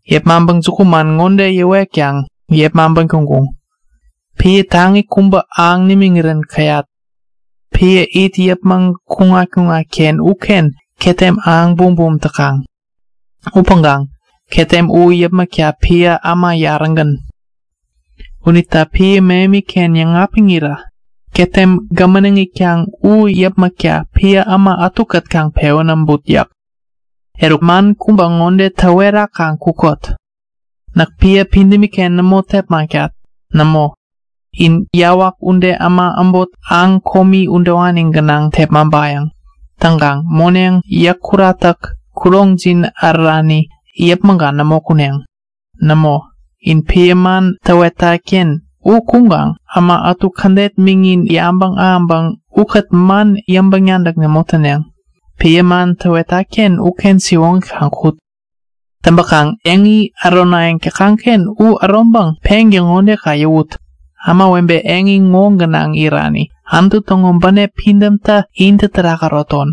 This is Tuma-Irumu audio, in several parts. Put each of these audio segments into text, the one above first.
Täŋkaŋ jukuman ŋode yäwetkaŋ yepmaŋpän kuŋkuŋ; Piä taŋi kubä ahäŋ nimiŋirän käyat. Piä it yäpmäŋ kukaŋ-ken uken ketem ahäŋ bumbum täkaŋ. Upäŋkaŋ ketem u yäpmäkta piä äma yarägän. Unita piä mähemi-ken yäŋapiŋirä ketem gämäneŋ itkaŋ u yäpmäkta piä äma ätukät kaŋ pewän äbut yäk. Eruk, man kubä ŋode täwerakaŋ kukot; Näk piä pidämi-ken nämo tepmaŋtat. Nämo, in yawak ude äma äbot aŋ komi udewani gänaŋ tepmaŋtat. Täŋkaŋ moneŋ, yäk kuratäk, kuroŋjin ärärani yäpmäŋkaŋ nämo kuneŋ. Nämo, in piä man täwetat-ken u kuŋkaŋ äma ätu kädet miŋin yabäŋ ahäŋpäŋ ukät man yäŋpäŋ-nadäk nämo täneŋ. Siwoŋi piä man täwetat-ken uken kaŋ kut. Täŋpäkaŋ eŋi äronayäŋ täkaŋ-ken u äroŋpäŋ pengän ŋode kaŋ yäwut; Ämawebe eŋi ŋo gänaŋ irani, Anutu täŋo bänep pidämtä intä terak äroton!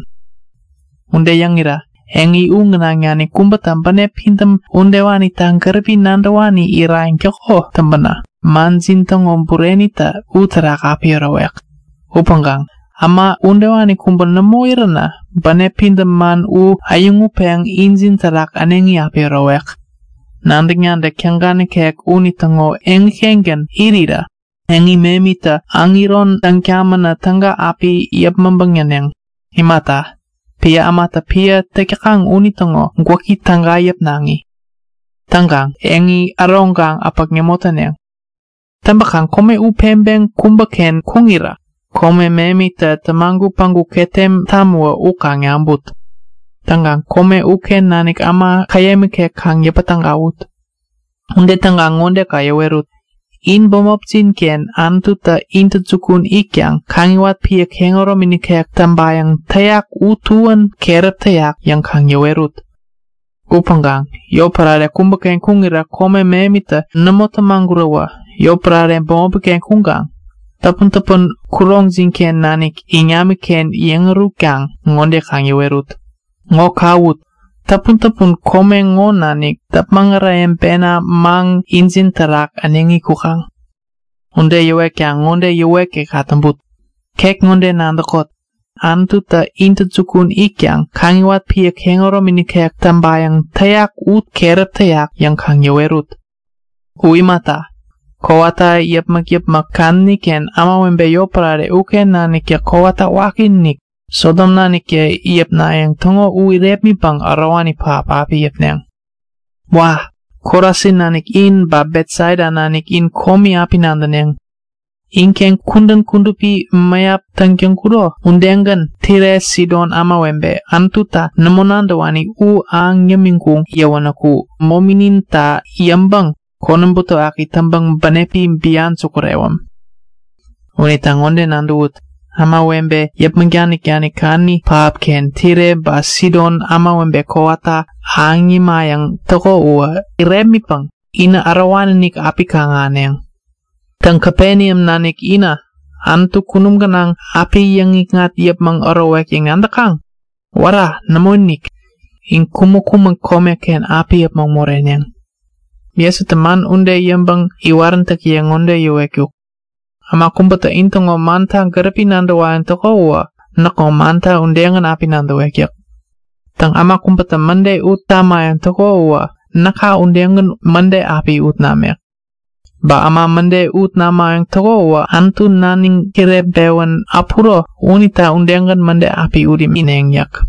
Ude yäŋirä eŋi u gänaŋ nanik kubätä bänep pidäm udewanita gäripi nadäwani irayäŋ täko täŋpänä manjin täŋo burenitä uterak api ärowek. Upäŋkaŋ äma udewani kubä nämo iränä bänep pidäm man u äyäŋutpeŋ injin terak äneŋi api ärowek. Nadäk-nadäk täga nikek unitäŋo eŋi-kengän irirä eŋi mähemitä äŋiron täŋ tamänä täga api yäpmäŋpäŋ näneŋ. Imata, piä ämatä piä täk täkaŋ unitäŋo gwäki täga yäpnaŋi. Täŋkaŋ eŋi äroŋkaŋ äpäk nämo täneŋ. Täŋpäkaŋ kome u peŋpeŋ kubäken kuŋirä kome mähemitä tämagut päŋku ketem tamäwä u kaŋ naŋput. Täŋkaŋ kome uken nanik äma käyäm ikek kaŋ yäpä tägawut. Ude täŋkaŋ ŋode kaŋ yäwerut; In bämopjin-ken Anututä intäjukun it tamiŋpäŋ tabäŋ tawat piä kehäromi nikek täŋpayäŋ täyak u tuän keräp täyak yäŋ kaŋ yäwerut. Upäŋkaŋ yotpärare kubäken kuŋirä kome mähemtä nämo tämaguräwä yotpärare bämopi-ken kuŋkaŋ täpun-täpun kuroŋjin-ken nanik iŋamiken yeŋ ärahutkaŋ ŋode kaŋ yäwerut; Ŋo kawut! Täpuntäpun kome ŋo nanik däpmäŋ äreyäŋpena maŋ injin terak äneŋi kukaŋ! Ude yäwetkaŋ ŋode yäwetgän kaŋ täŋput; Ket ŋode nadäkot! Anututä intäjukun it tamiŋpäŋ tabäŋ tawat piä täŋpayäŋ täyak u keräp täyak! yäŋ kaŋ yäwerut. U imata, kowata yäpmäk-yäpmäk kadäni-ken ämawebe yotpärare uken naniktä kowata wakiinik, Sodom naniktä yäpnayäŋ täŋo u irepmitpäŋ ärowani pähap api yäpneŋ. Wa! Korasin nanik in, ba Betsaida nanik in komi api nadäneŋ! Inken kudän kudupi mäyap täk täŋkuro udegän Tire Sidon ämawebe, Anututa nämo nadäwani u ahäŋ yämiŋkuk yäwänäku mominita yäŋpäŋ konäm butewaki täŋpäŋ bänepi bian sukurewäm! Unita ŋode nadäwut; Ämawebe yäpmäŋ danik-danik kadäni pähapken Tire ba Sidon ämawebe kowata ahäŋ yämayäŋ täko u irepmitpäŋ inä ärowani-inik api kaŋ-ahäneŋ! Täŋ, Kapeneam nanik inä, Anututä kunum gänaŋ api yäŋnikŋat yäpmäŋ ärowek yäŋ nadäkaŋ? Wära! Nämoinik! In kumäŋ-kumäŋ komeken api äpmoŋ moreneŋ. Jesutä man ude yäŋpäŋ iwaräntäkiye ŋode yäwetkuk; Äma kubätä intäŋo manta gäripi nadäwayäŋ täko uwä näkŋo mannata udegän api nadäwek yäk. Täŋ, äma kubätä mäde ut tamayäŋ täko uwä näka udegän mäde api ut namek. Ba äma mäde ut naminayäŋ täŋo uwä Äma naniŋ kireŋpewän äpuro unita udegän mäde api ut imineŋ yäk.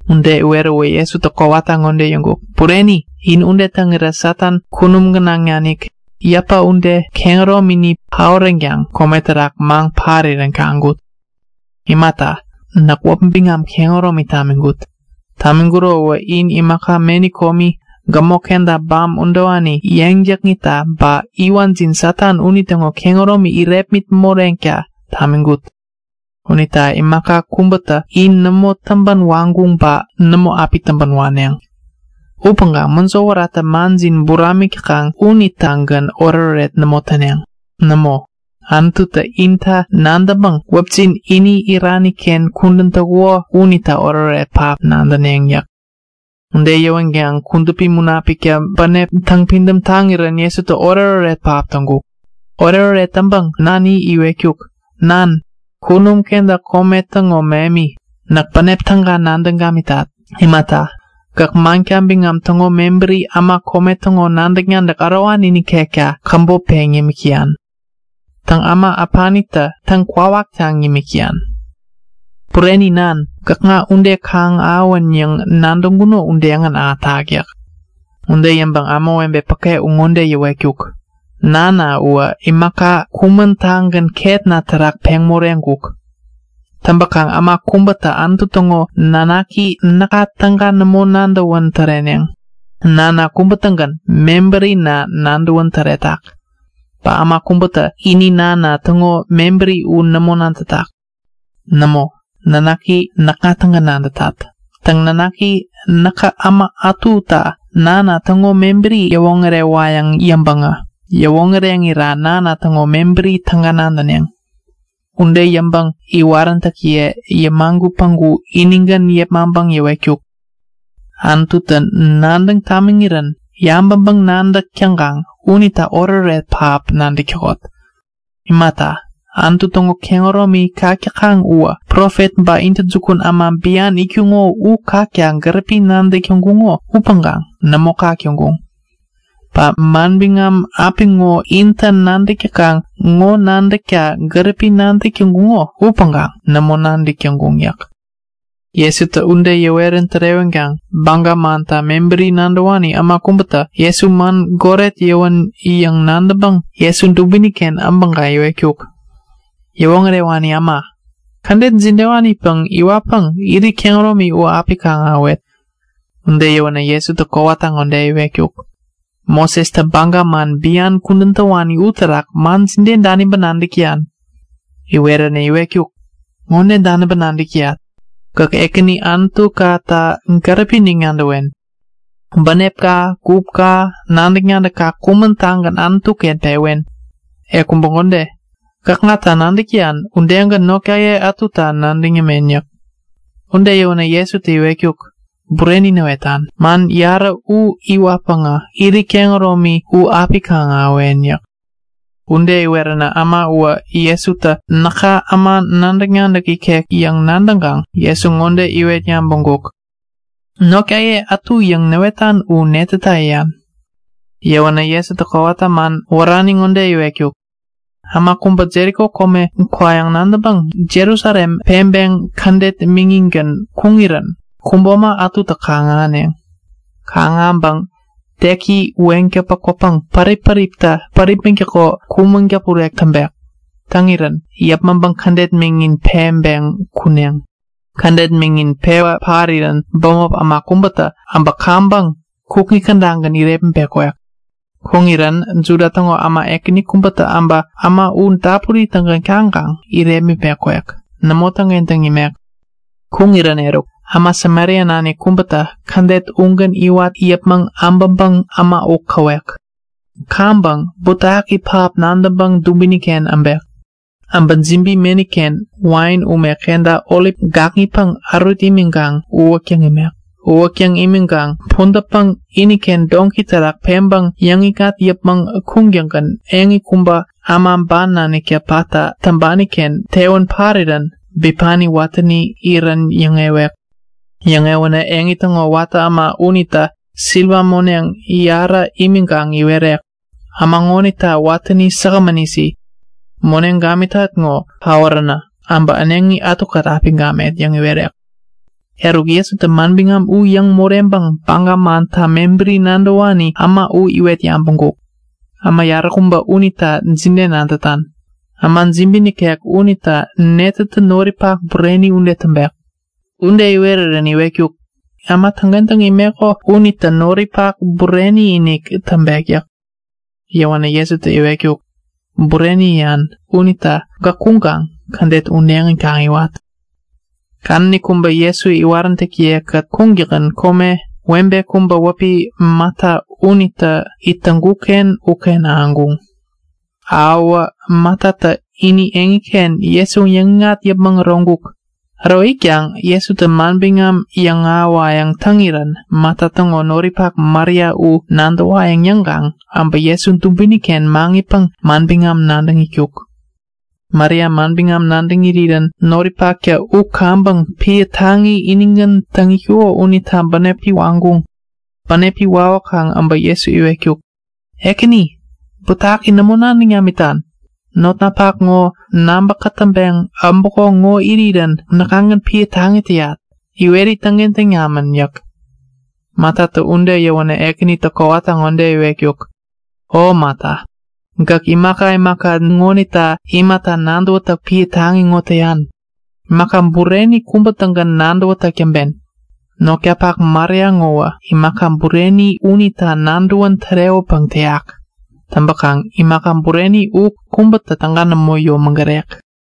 Ude iweräwä Jesutä kowata ŋode yäwetkuk; Bureni! In ude täŋirä Satan kunum gänaŋ nanik, yäpä ude, kehäromini paoränkaŋ kome terak maŋ parirän kaŋkut. Imata, näk kehäromi tamiŋkut. Kehäromi tamiŋkuro uwä in imaka meni komi, gämok kenta bam udewani yeŋ jakŋitta, ba iwanjin Satan unitäŋo kehäromi irepmit moreneŋta tamiŋkut. Unita imaka kubätä in nämo täŋpän waŋkuŋ ba nämo api täŋpän waneŋ. Upäŋkaŋ mäjo wäratä manjin buramik täkaŋ unitagän oretoret nämo täneŋ. Nämo, Anututä inta nadäŋpäŋ wäpjin ini irani-ken kudän täŋkuko unita oretoret pähap nadäneŋ yäk. Ude yäwänkaŋ Kudupi Munapiktä bänepi täŋpidäm taŋirän Jesutä oretoret pähap täŋkuk. Oretoret täŋpäŋ nani iwetkuk; Nan, kunum kenta kome täŋo mähemi, näk bänep täga nadäŋ gamitat. Imata, gäk manka biŋam täŋo mebäri äma kome täŋo nadäk-nadäk ärowani nikekta käbop peŋ yämik täyan. Täŋ, äma äpanita täŋ-kwawataŋ yämik täyan. Bureni Nan, gäkŋa ude kaŋ ahäwän yäŋ nadäŋkuno udegän ahätak yäk. Ude yäŋpäŋ ämawebe päke u ŋode yäwetkuk; Nana uwä imaka kumän-tagän ketna terak peŋ moreŋkuk. Täŋpäkaŋ äma kubätä Anutu täŋo nanaki näka täga nämo nadäwän täreneŋ. Nana kubä-tägän mebärina nadäwän täretak. Ba äma kubätä ini Nana täŋo mebäri u nämo nadätak. Nämo, nanaki näkŋa-tägän nadätat. Täŋ, Nanaki näkä äma ätuta Nana täŋo mebäri yäwoŋärewayäŋ yäŋpäŋä yäwoŋäreŋira Nana täŋo mebäri täga nadäneŋ. Ude yäŋpäŋ iwaräntäkiye yämagut päŋku inigän yepmaŋpäŋ yäwetkuk; Nadäkaŋ? Anututä nadäŋ tamiŋirän yabäŋpäŋ-nadäk täkaŋ unita oretoret pähap nadäk täkot! Imata, Anutu täŋo kehäromi kak täkaŋ uwä profet ba intäjukun äma bian itkuŋo u kakta gäripi nadäk täŋkuŋo upäŋkaŋ nämo kak täŋkuŋ. Ba manbiŋam apiŋo intä nadäk täkaŋ ŋo nadäkta gäripi nadäk täŋkuŋo upäŋkaŋ nämo nadäk täŋkuŋ yäk. Jesutä ude yäwän tärewäkaŋ Baga manta mebäri nadäwani äma kubätä Jesu man goret kubä yäwän nadäwa yäŋkaŋ Jesu dubini-ken äbäŋpäŋ iwetkuk; Yäwoŋärewani äma, kädet jidewanipäŋ iwatpäŋ irit kehäromi u api kaŋ-ahäwet? Ude yäwänä Jesutä kowata ŋode iwetkuk; Mosestä Baga man bian kudän täwani uterak man jide daniŋpäŋ nadäk täyan? Iweränä iwetkuk; Ŋode daniŋpäŋ nadäk täyat; Gäk Ekäni Anutukata gäripi-inik nadäwen. Bänepka, gupka, nadäk-nadäkka kumän-tagän Anutu-ken pewen. E kubä ŋode; Gäkŋata nadäk täyan udegän notkaye ätuta nadäŋ yämen yäk. Ude yäwänä Jesutä iwetkuk; Bureni näwetan. Man yarä u iwatpäŋä irit kehäromi u api kaŋ-ahäwen yäk. Ude iweränä äma uwä Jesutä näka äma nadäk-nadäk ikek yäŋ nadäwän yäŋ nadäŋkaŋ Jesu ŋode iwet yabäŋkuk; Baga mantä notkaye ätu yäŋ yäyak u netäta yäyak? Yäwänä Jesutä kowata man wärani kubä ŋode iwetkuk; Äma kubä Jeriko kome kwayäŋ nadäŋpäŋ Jerusalem peŋpeŋ kädet miŋingän kuŋirän kubo äma ätutä kaŋ-ahäneŋ. Kaŋ-ahäŋpäŋ teki weŋ täŋpä kwäpäŋ pärip-päriptä päripmäŋtäko kumäŋ-däpurek täŋpek. Täŋirän yäpmäŋpäŋ kädet miŋin peŋpeŋ kuneŋ. Kädet miŋin pewä parirän bämop äma kubätä äbä kaŋpäŋ kukŋi kädagän irepmitpeŋ kwek. Kuŋirän Juda täŋo äma ekäni kubätä äbä äma u dapuri-tägän kaŋkaŋ udegän irepmitpeŋ kukŋi kädagän kwek. Nämo täŋkentäŋ imek. Kuŋirän eruk, äma Samaria nanik kubätä kädet ugän iwat yäpmäŋ äbäŋpäŋ äma u käwek. Kaŋpäŋ butewaki pähap nadäŋpäŋ dubini-ken äbek. Äbä jibi meni-ken wain ume kenta olip gakŋipäŋ ärut imiŋkaŋ uwäktäŋ imek. Uwäktäŋ imiŋkaŋ pudätpäŋ iniken doŋki terak peŋpäŋ yäŋikŋat yäpmäŋ kuŋtäŋgän eŋi kubä, äma ban naniktä patta täŋpani-ken tewän parirän bipani watäni irän yäŋewek. Yäŋewänä eŋi täŋo watä äma unita siliwa moneŋ yarä imiŋkaŋ iwerek; Äma ŋonita watäni säkgämän isi. Moneŋ gamitat ŋo paoränä äbä äneŋi ätukät api gamet yäŋ iwerek. Eruk, Jesutä manbiŋam u yäŋ moreŋpäŋ Baga manta mebäri nadäwani äma u ŋode iwet yabäŋkuk; Äma yaräkubä unita jide nadätan? Äma jibi nikek unita netätä noripak bureni ude täŋpek? Ude iwerirän iwetkuk; Äma täŋkentäŋ imeko unitä noripak bureni-inik täŋpek yäk. Yäwänä Jesutä iwetkuk; Bureni yäyan unita gäk kuŋkaŋ kädet udegän kaŋ iwat! Kadäni kubä Jesu iwaräntäkiye-kät kuŋtäŋgän, webe kubä wäpi Mata unitä komeken ahäŋkuŋ. Uken ahäŋirä Matatä ini eŋiken Jesu yäŋikŋat yäpmäŋ äroŋkuk. Äro itkaŋ Jesutä manbiŋam yäŋahäwayäŋ täŋirän Mata täŋo noripak Maria u nadäwayäŋ yäŋkaŋ äbä Jesu dubini-ken maŋitpäŋ manbiŋam nadäŋ itkuk. Maria manbiŋam nadäŋ irirän noripaktä u kaŋpäŋ piä taŋi inigän täŋ itkuko unita bänepi waŋkuŋ. Bänepi wawäkaŋ äbä Jesu iwetkuk; Ekäni, butewaki nämo nadäŋ namitan? Notnapak ŋo nabä kätäŋpeŋ äbäko ŋo irirän näkŋagän piä taŋi täyat. Iweri täŋkentäŋ namän! yäk. Matatä ude yäwänä Ekänitä kowata ŋode iwetkuk; O Mata, gäk imaka imaka ŋonita imata nadäwätäk pähap täyan? Imaka bureni kubätagän nadäwen. Notkapak Maria ŋowä imaka bureni unita nadäwän tärewäpäŋ täyak. Täŋpäkaŋ imaka bureni ŋowä kubätä täga nämo yomägarek.